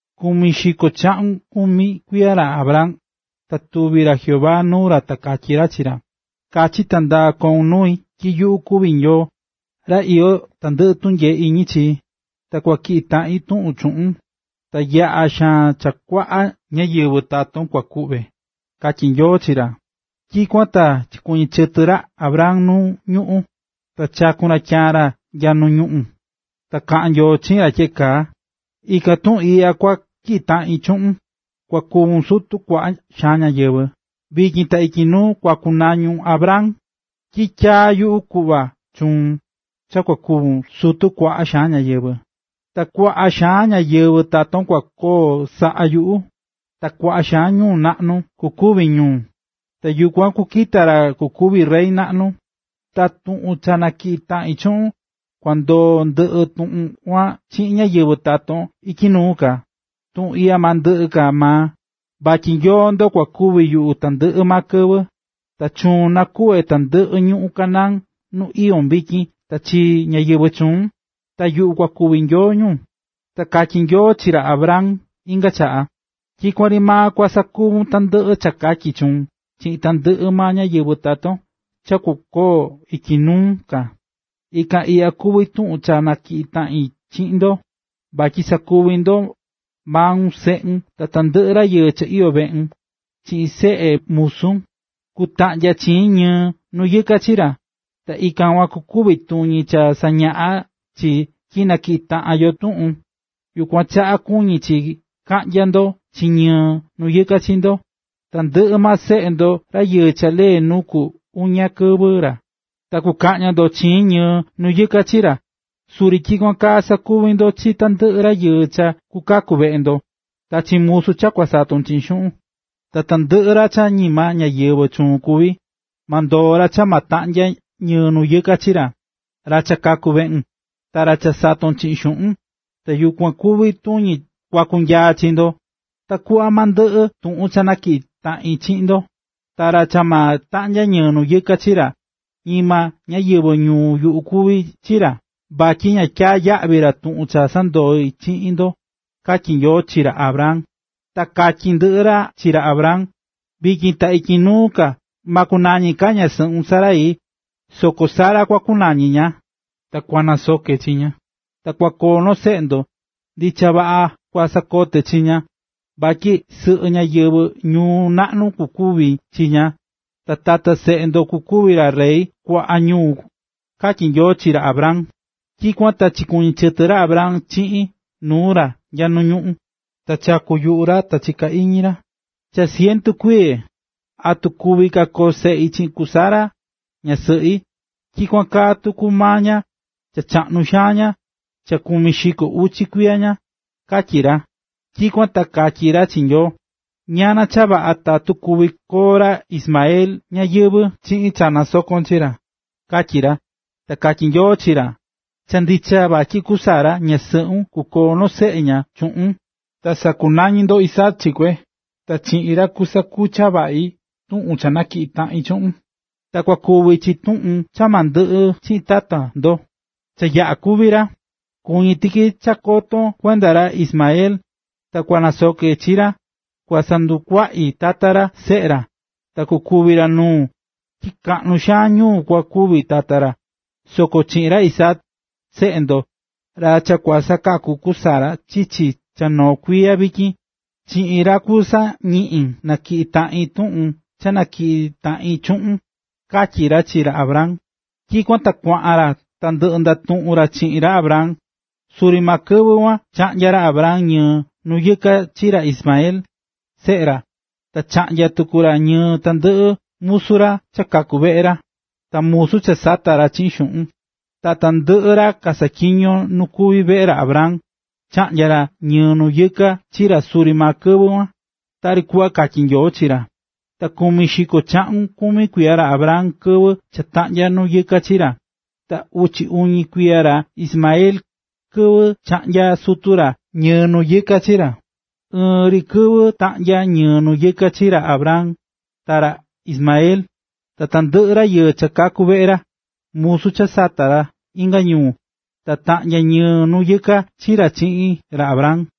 Kumi xiko chaꞌun kumi kuiya ra Abram, ta tuvi̱ ra Jehová nuu ra ta katyí ra chi ra: ―Kachi ta ndaa koun nuu yuꞌu tyi yuꞌu kuví Nyoo, ra iyó tandɨꞌɨ tunyee iñi chi. Ta kua tyiꞌi taꞌin tuꞌun chuꞌun, ta yaꞌa xaan cha kuaꞌa ñáyɨvɨ taton kua kuꞌve ―katyí Nyoo chi ra. Tyikuan ta chikuɨñɨ̱ chɨtɨ ra Abram nu ñuꞌún, ta chaku̱n ra tyaan ra nya nuu ñuꞌún, ta kaꞌán Nyoo chiꞌin ra tyeꞌe kaa: ―Ikan tuꞌun iꞌya kua tyiꞌi taꞌin chuꞌun, kua kuvun sutu kuaꞌa xaan ñáyɨvɨ. Vityin ta ityi nuu, kua kunañun Abraham, tyi tyaa̱ yuꞌu kuꞌva chuun cha kuvun sutu kuaꞌa xaan ñáyɨvɨ. Ta kuaꞌa xaan ñáyɨvɨ taton kua koo saꞌa yuꞌu, ta kuaꞌa xaan ñuu naꞌnu kukuvi ñu, ta yukuan kukita ra kukuvi rey naꞌnu. Ta tuꞌun cha natyiꞌi taꞌin chuꞌun, kua ndoo ndɨꞌi tuꞌun kuan chiꞌin ñáyɨvɨ taton ityi nuu ka. Tuꞌun iꞌya ma ndɨꞌɨ ka maa, vatyi Nyoo ndo kua kuvi yuꞌu tandɨꞌɨ maa kɨvɨ. Ta chuun nakuꞌve tandɨꞌɨ ñuꞌún Canaán nu iyón vityin ta chi ñáyɨvɨ chuun, ta yuꞌu kua kuvi Nyoo ñu. Ta katyí Nyoo chi ra Abraham inga chaꞌa: ―Tyikuan ri maa kua sakuvun tandɨꞌɨ cha katyi chuun chiꞌin tandɨꞌɨ maa ñáyɨvɨ taton cha kukoo ityi nuu ka. Ikan iꞌya kuví tuꞌun cha natyiꞌí taꞌin chiꞌin ndo, vatyi sakuvi ndo: maun, seꞌun, ta tandɨꞌɨ rayɨɨ cha iyó veꞌun, chiꞌin seꞌe musun: Kutaꞌnya chiin ñɨɨa nu yɨka chi ra. Ta ikan kuan kuvi tuñi cha sañaꞌá chi tyi na tyiꞌi̱ taꞌan yo tuꞌun, yukuan chaꞌa kuñí chi kaꞌnya ndo chiin ñɨɨ nu yɨka chi ndo. Tandɨꞌɨ maa seꞌe ndo rayɨɨ cha lee nu ku uña kɨvɨ ra, ta kukaꞌnya ndo chiin ñɨɨ nu yɨka chi ra, suri tyikuan kaa sakuvi ndo chi tandɨꞌɨ rayɨɨ cha kukaku veꞌe ndo, ta chi musu cha kusaton chiꞌin xuꞌun. Tandɨꞌɨ ra cha ñima ñáyɨvɨ chuun kuví, ma ndoo ra cha ma taꞌnya ñɨɨ nu yɨka chi ra, ra cha kaku̱ veꞌun, ta ra cha sato̱n chiꞌin xuꞌun. Ta yukuan kuvi tuñi kua kunyaa chi ndo, takuꞌva ma ndɨꞌɨ tuꞌun cha natyiꞌí taꞌin chiꞌin ndo. Ta ra cha ma taꞌnya ñɨɨ nu yɨka chi, ñima ñáyɨvɨ ñuu yuꞌu kuvi ra vatyi ña tyaá yaꞌvi ra tuꞌun cha sandoí chiꞌin ndo ―katyí Nyoo chi ra Abraham. Ta katyí ndɨꞌɨ ra chi ra Abraham: ―Vityin ta ityi nuu ka ma kunañi ka ñasɨꞌun Sarai, soko Sara kua kunañi ña. Ta kua nasoke chi ña, ta kua koo noo seꞌe ndo. Ndicha vaꞌa kua nasoke chi ña, vatyi sɨꞌɨ ñáyɨvɨ ñuu naꞌnu kukuvi chi ña, ta tata seꞌe ndo kukuvi ra rey kuaꞌa ñuu ―katyí Nyoo chi ra Abraham. Tyikuan ta chikuɨñɨ̱ chɨtɨ ra Abraham chiꞌin nuu ra nya nu ñuꞌún, ta chakú yuꞌu ra ta chiká iñi ra: “Cha cientu kuiye, ¿atu kuvi ka koo seꞌi chiꞌin ku Sara, ñasɨꞌi? Tyikuan kaa tuku maa ña, cha chaꞌnu xaan ña, cha kumi xiko uchi kuiya ña”, katyí ra. Tyikuan ta katyí ra chi Nyoo: ―¡Ñana cha vaꞌa tatu kuvi koo ra Ismael ñayɨvɨ̱ chiꞌin cha nasakón chi ra! ―katyí ra. Ta katyí Nyoo chi ra: ―Cha ndicha vatyi ku Sara, ñasɨꞌun, kukoo noo seꞌe ña chuꞌun, ta sakunañi ndo Isaac chi kue. Ta chiꞌin ra kusakucha vaꞌi tuꞌun cha natyiꞌi taꞌin chuꞌun, ta kukuvi chi tuꞌun cha ma ndɨꞌɨ chiꞌin tata ndo, cha yaꞌa̱ kúvi ra. Chiñi̱ tiki cha chiko̱n kuenda ra Ismael, ta kua nasoke chi ra, kua sandukuaꞌi tata ra, ta kukoo uchi uvi taꞌan seꞌe ra ta kukuvi ra nuu, tyi kaꞌnu xaan ñuu kua kuvi tata ra. Soko chiꞌin ra Isaac, seꞌe ndo, ra cha kua sakaku ku Sara chichi cha noo kuiya vityin, chiꞌin ra kuan kusañiꞌin natyiꞌi taꞌin tuꞌun cha natyiꞌi̱ taꞌin chuꞌun ―katyí ra chi ra Abraham. Tyikuan ta kuaꞌan ra cha ndɨꞌɨ ndatuꞌu̱n ra chiꞌin ra Abraham. Suri maa kɨvɨ kuan chaꞌnya̱ ra Abraham ñɨɨ nu yɨka chi ra Ismael, seꞌe ra, ta taꞌnya tuku ñɨɨ tandɨꞌɨ musu ra cha kaku̱ veꞌe ra, ta musu cha sata̱ ra chiꞌin xuꞌun. Tandɨꞌɨ maa ra kasaꞌatyiñó nu kuví veꞌe ra Abraham, chaꞌnya̱ ra ñɨɨ nu yɨka chi ra suri maa kɨvɨ kuan, tari kuꞌva katyí Nyoo chi ra. Ta kumi xiko chaꞌun kumi kuiya ra Abraham kɨvɨ cha taꞌnya̱ ñɨɨ nu yɨka chi ra. Ta uchi uñi kuiya ra Ismael, kɨvɨ chaꞌnya̱ sutu ra ñɨɨ nu yɨka chi ra. Ɨɨn ri kɨvɨ taꞌnya̱ ñɨɨ nu yɨka chi ra Abraham, ta ra Ismael. Ta tandɨꞌɨ rayɨɨ cha kaku̱ veꞌe ra, musu cha sata̱ ra inga ñuu, taꞌnya̱ ñɨɨ nu yɨka chi ra chiꞌin ra Abraham.